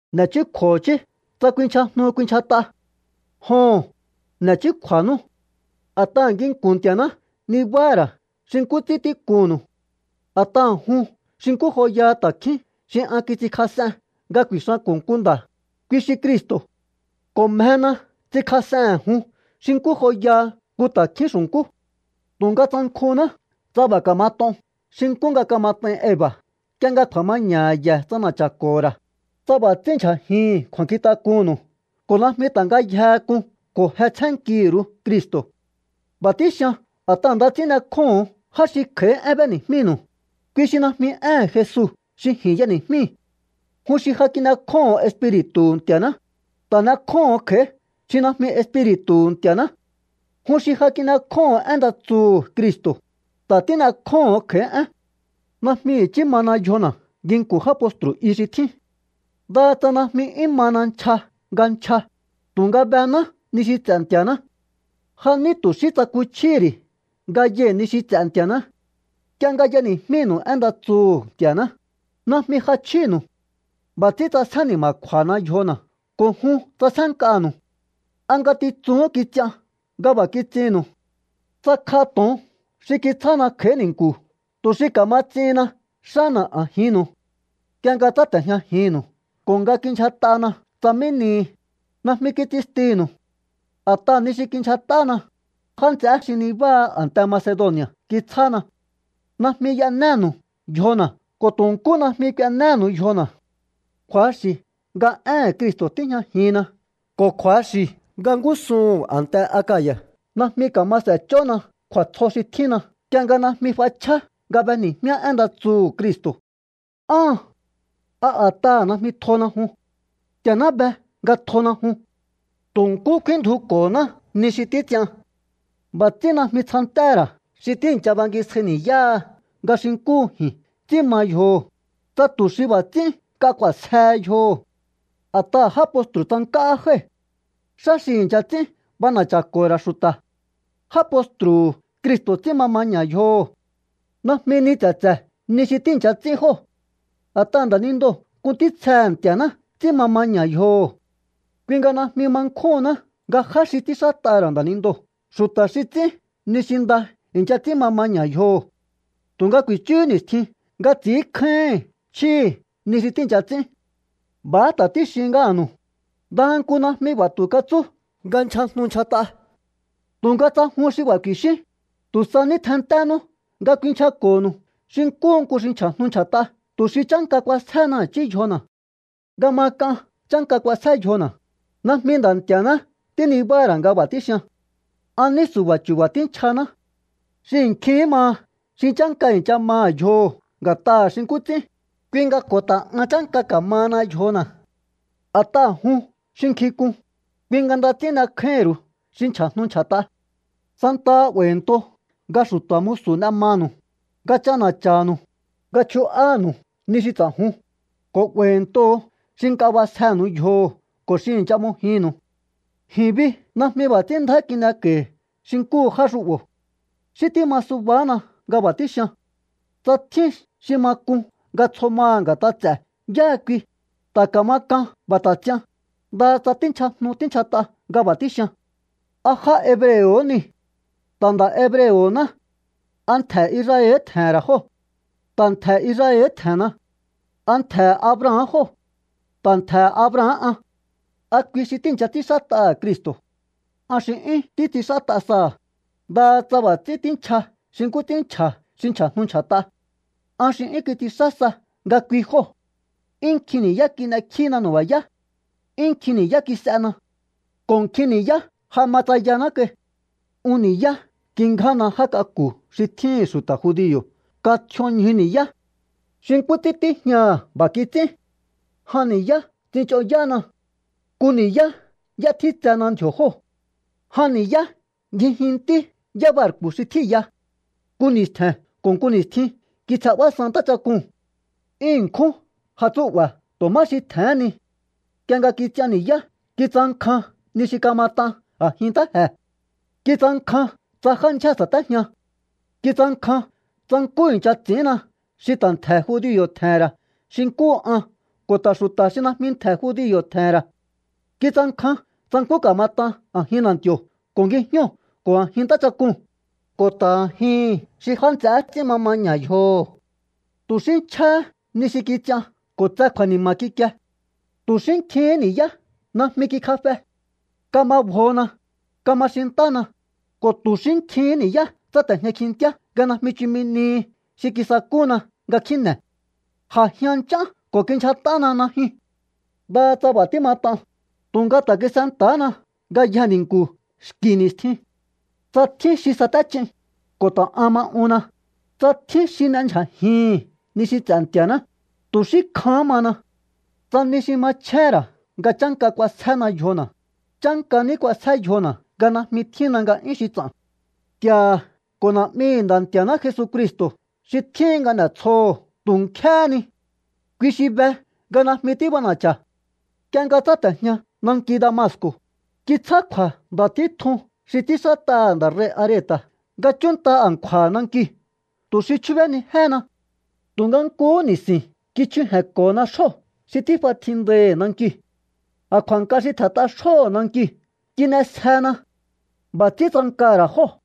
N'e̱chúkju̱o i̱chí tsa kuinchjajnu kuinchjat'a. Joho̱n, n'e̱ chúkju̱a̱nú. A̱t'aha̱ nginku̱n Nti̱a̱ná nibáha̱ ra̱ xi nkú ts'ín tíkunnu̱u. A̱t'aha̱ jun xi nkú joyaha ta̱kjín xi an kits'inkjas'en nga ku̱i̱xanko̱ nku nda̱, kui xi Cristo̱. Ko̱ mjena ts'inkjas'ehe̱n jun xi nkú joyaha nku ta̱kjín xu̱nkú. Tu̱nga tsankjunná tsa b'a̱ ka̱mat'on xi nkú nga kamat'ain Eva̱ nk'ie nga kju̱a̱maña̱ha̱ ye̱ ts'ana̱cha̱ko̱ho̱ ra̱, tsa b'a̱ ts'ínndyja̱jihin kju̱a̱nkjintak'unnu̱u ko̱ najmi ta̱ ngayjehe k'un ko̱ je tsjénnkihi̱ ru̱u Cristo̱. B'a̱ tíxian a̱t'aha̱ nda ts'ín n'ekjóho̱on já xi kj'a̱í én b'éni̱jmínu̱u, kui xi najmi éhe̱n Jesu xi ji̱n y'eni̱jmíi̱. Jun xi ja kin'ekjóho̱n Espiri̱tu̱hu̱ Nti̱a̱ná, ta̱ n'ekjóho̱n kj'a̱í xi najmi Espiri̱tu̱hu̱ Nti̱a̱ná. Jun xi ja kin'ekjóho̱n én nda tsuhu̱ Cristo̱, ta̱ tín'ekjóho̱n kj'a̱í én. Najmi i̱chí mana yjona̱ nginku̱n já postru̱ i xi tjín. Ndaha tsa najmi 'yún mana nchja nga nchja, tu̱nga bená ni xi ts'e̱ Nti̱a̱ná. Ja ní tu̱ xí tsakuchjíhí ri̱ nga yai̱ ni xi ts'e̱ Nti̱a̱ná. Nk'ie nga y'eni̱jmínu̱u én nda tsuhu̱ Nti̱a̱ná, najmi j'achjínu̱u. B'a̱ ts'ín ts'asjé ni̱ma̱kju̱a̱hana yjona̱ ko̱ jun ts'asjénk'anu̱u. ¿A ngatitsuhún kits'ian nga b'a̱ kits'innu̱u? Tsakj'a to̱on xi kitsjána kj'a̱í ni̱nku̱ tu̱ xi ka̱ma ts'ihinna xána̱ a̱jinnu̱u. Nk'ie nga tsáte̱jñajinnu̱u ko̱ nga kindyjat'ana tsa mí nihi, najmi kits'instinu̱u. A̱t'aha̱ ni xi kindyjat'ána, já nts'eé xi nibáha a̱nte Macedoni̱a̱ kitsjána. Najmi y'enénu̱u yjona̱ ko̱ tu̱ nkú najmi k'uenéhénu̱u yjona̱. Kju̱axi̱ nga éhe̱n Cristo̱ tíjñajinna ko̱ kju̱axi̱ nga ngúsuhu̱n a̱nte Akaya̱ najmi ka̱ma s'e̱ch'ónna kju̱a̱tsjo xi tjínna nk'ie nga najmi f'achjá nga b'eni̱jmíá én nda tsuhu̱ Cristo̱. ¿Áhan? ¿A a̱t'aha̱ najmi tjona jun? Nti̱a̱ná be nga tjona jun. Tu̱ nkú kfínndjuko̱ná ni xi títs'ian. B'a̱ ts'ín najmi tsjantéhe̱ ra̱ xi tíi̱ncha bangisjai ni̱yáha nga xi nkúhu ji̱n ts'i̱ín ma yjoho̱, tsa tu̱ xi b'a̱ ts'ín nk'a k'u̱a̱sjehe yjoho̱. A̱t'aha̱ já postru̱ tsank'áhá jái̱. Xá xi i̱ncha ts'ín b'ana̱cha̱ko̱ho̱ ra̱ xu̱ta̱. Já postru̱hu̱ Cristo̱ ts'ín ma maña̱ yjoho̱. Najmi ni tse̱tse̱ ni xi tíi̱ncha ts'ín jóo̱. A̱t'aha̱ nda̱nindoo̱ nku ntítsjehe̱ Nti̱a̱ná ts'ín ma maña̱ yjoho̱. Kui nga najmi ma nkjúhunná nga já xi ts'ínxát'aha̱ ra̱ nda̱nindoo̱ xu̱ta̱ xi ts'ín ni xi nda i̱ncha ts'ín ma maña̱ yjoho̱. Tu̱nga ku̱i̱chúhú ni̱stjin nga ts'i̱ínkjáíhi̱n chjíhi̱ ni xi tíi̱ncha ts'ín. B'a̱há ta̱ tíxin ngáha̱nu̱u. Ndaha nku najmi b'a̱ tu̱ katsú nga nchjajnu nchjat'a. Tu̱nga tsa jun xi b'a̱ ku̱i̱xíún, tu̱ sa ní tjennténú nga kuinchjako̱nu̱u xi nkúhu nku xi nchja̱jnu nchja̱t'a tu̱ xi chánka k'uasjéhena i̱chí yjona̱. Nga ma k'an chánka k'uasjé yjona̱, najmi Nda̱ Nti̱a̱ná tínibáha̱ ra̱ nga b'a̱ tíxian. An ní su̱ba̱ chu̱ba̱ tínchjaná. Xihi̱ nkjihín maha xi chánka i̱ncha maha̱ yjoho̱ nga̱t'aha̱ xi nkú ts'ín, kui nga ko̱ ta̱ an chánka ka̱mahana yjona̱. A̱t'aha̱ jun xi nkjink'un, kui nga nda ts'ín n'ekjáíhi̱n ru̱u xi nchja̱jnu nchja̱t'a. Santaha 'ba̱i̱nto nga xu̱ta̱ musu̱ n'e manu̱u, nga ch'ana̱cha̱nu̱u, nga chju'ánu̱u ni xi ts'a̱jun, ko̱ 'ba̱i̱ntoho̱ xi nk'a b'asjenu̱u yjoho̱ ko̱ xi i̱ncha m'ojinnu̱u. Ji̱n bi najmi b'a̱ ts'ín ndjá kin'eko̱i̱hi̱ xi nkúhu já xu'bo̱. Xí tíma subahána nga b'a̱ tíxian. Tsa tjín xi ma k'un nga tsjo maha̱ nga̱t'a ts'e̱ yáha kui, ta̱ ka̱ma k'an b'a̱ ta̱ ts'ian, ndaha tsa tínchjajnu tínchjat'a nga b'a̱ tíxian. ¿A já hebreo̱ niu̱? Ta̱ nda̱ hebreo̱ná. ¿A ntje̱ Israel tje̱he̱n ra̱ jóo̱? Ta̱ ntje̱ Israel tje̱henna. ¿A ntje̱he̱ Abraham jóo̱? Ta̱ ntje̱he̱ Abraham an. ¿A kui xi tíi̱ncha ts'ínxát'aha̱ Cristo̱? An xi 'yún títs'inxát'a saha̱, ndaha tsa b'a̱ ts'ín tínchja xi nkú ts'ín nchja̱ xi nchja̱jnu nchja̱t'a. An xi 'yún kits'inxá sa nga kui jóo̱. 'Yún nkjin ni̱yá kin'ekjína nu̱ba̱yá. 'Yún nkjin ni̱yá kis'ena. Ko̱ nkjin ni̱yá ja ma tsayaná kai. Un ni̱yá kingjána já k'aku̱ xi tjíhi̱n xu̱ta̱ judio̱ kan tj'ion ñju ni̱yá. Xi nkú ts'ín tíjñaha̱, b'a̱ kits'ín. Jan ni̱yá tsich'onyána. Nku ni̱yá y'étjítsena ndji̱o̱ jóo̱. Jan ni̱yá ngjijintí yábarku̱ xi tjíi̱ya. Nku ni̱stje̱n ko̱ nku ni̱stjin kitsjenb'ásan ntáchak'uu̱n. 'Yún ṉkjún jatsúu̱'ba̱ tu̱ má xi tje̱hén ni. Nk'ie nga kits'ian ni̱yá kitsankjan ni xi ka̱mat'an a̱jin ntáje̱. Kitsankjan tsa já ndyjée̱ sa̱téjian. Kitsankjan tsa nkú i̱ncha ts'i̱ínna xi ta̱ ntje̱ judio̱ tje̱he̱n ra̱ xi nkúhu an ko̱ ta̱ xu̱ta̱ xi najmi ntje̱ judio̱ tje̱he̱n ra̱. Kitsankjan tsa nkú ka̱mat'an a̱jin na̱nti̱o̱ ko̱ ngijñóo̱ ko̱ a̱jin ntáchak'uu̱n, ko̱ ta̱ a̱jihi̱n xi já nts'eé ts'ín ma maña̱ yjoho̱. Tu̱ xí nchjáhá ni xi kits'ian ko̱ tse kju̱a̱ni̱ma̱ kikie. Tu̱ xí nkjihín ni̱yá najmi kikjafe. Kama bjona, kama xintána, ko̱ tu̱ xí nkjihín ni̱yá tsáte̱jña kjintíá nga najmi chumi nihi xi kisakúna nga kjíne̱. J'ajian nch'án ko̱ kindyjat'ána najyun. Ndaha tsa b'a̱ tímat'an, tu̱nga ta̱ kis'enta̱hána ngayjee̱ ni̱nku̱ xki̱ ni̱stjin. Tsa tjín xi saté ch'in, ko̱ ta̱ an ma unna. Tsa tjín xi n'endyjajihi̱n ni xi ts'e̱ Nti̱a̱ná, tu̱ xí kjahán mana. Tsa ni xi machjéhe̱n ra̱ nga chánka k'uasjéhena yjona̱, chánka ní k'uasjé yjona̱ nga najmi tjínna nga'yún xi ts'a̱n. Nti̱a̱ha̱ ko̱ Na̱'mihi̱ Nda̱ Nti̱a̱ná Jesucristo̱ xi tjíhin nga n'e̱tsjoho̱ tu̱ nkjéhé ni. Kui xi be nga najmi tíb'ana̱cha̱. Nk'ie nga tsáte̱jña nanki Damasco̱, kitsjá kju̱a̱ nda̱ títjun xi ts'ínxát'aha̱ nda̱ rei̱ Areta̱ nga chúnnta a̱nkju̱a̱ha̱ nankiu̱ tu̱ xi chjúbénijéhena. Tu̱nga nkuhú ni̱si̱n kichjuje̱nko̱hona xjó xi tíf'a tjindaihi̱ nankiu̱. A̱nkju̱a̱nk'a xi tje̱nt'a xjóho̱ nankiu̱ kin'esjehena. B'a̱ ts'ín tsankaha̱ ra̱ jóo̱.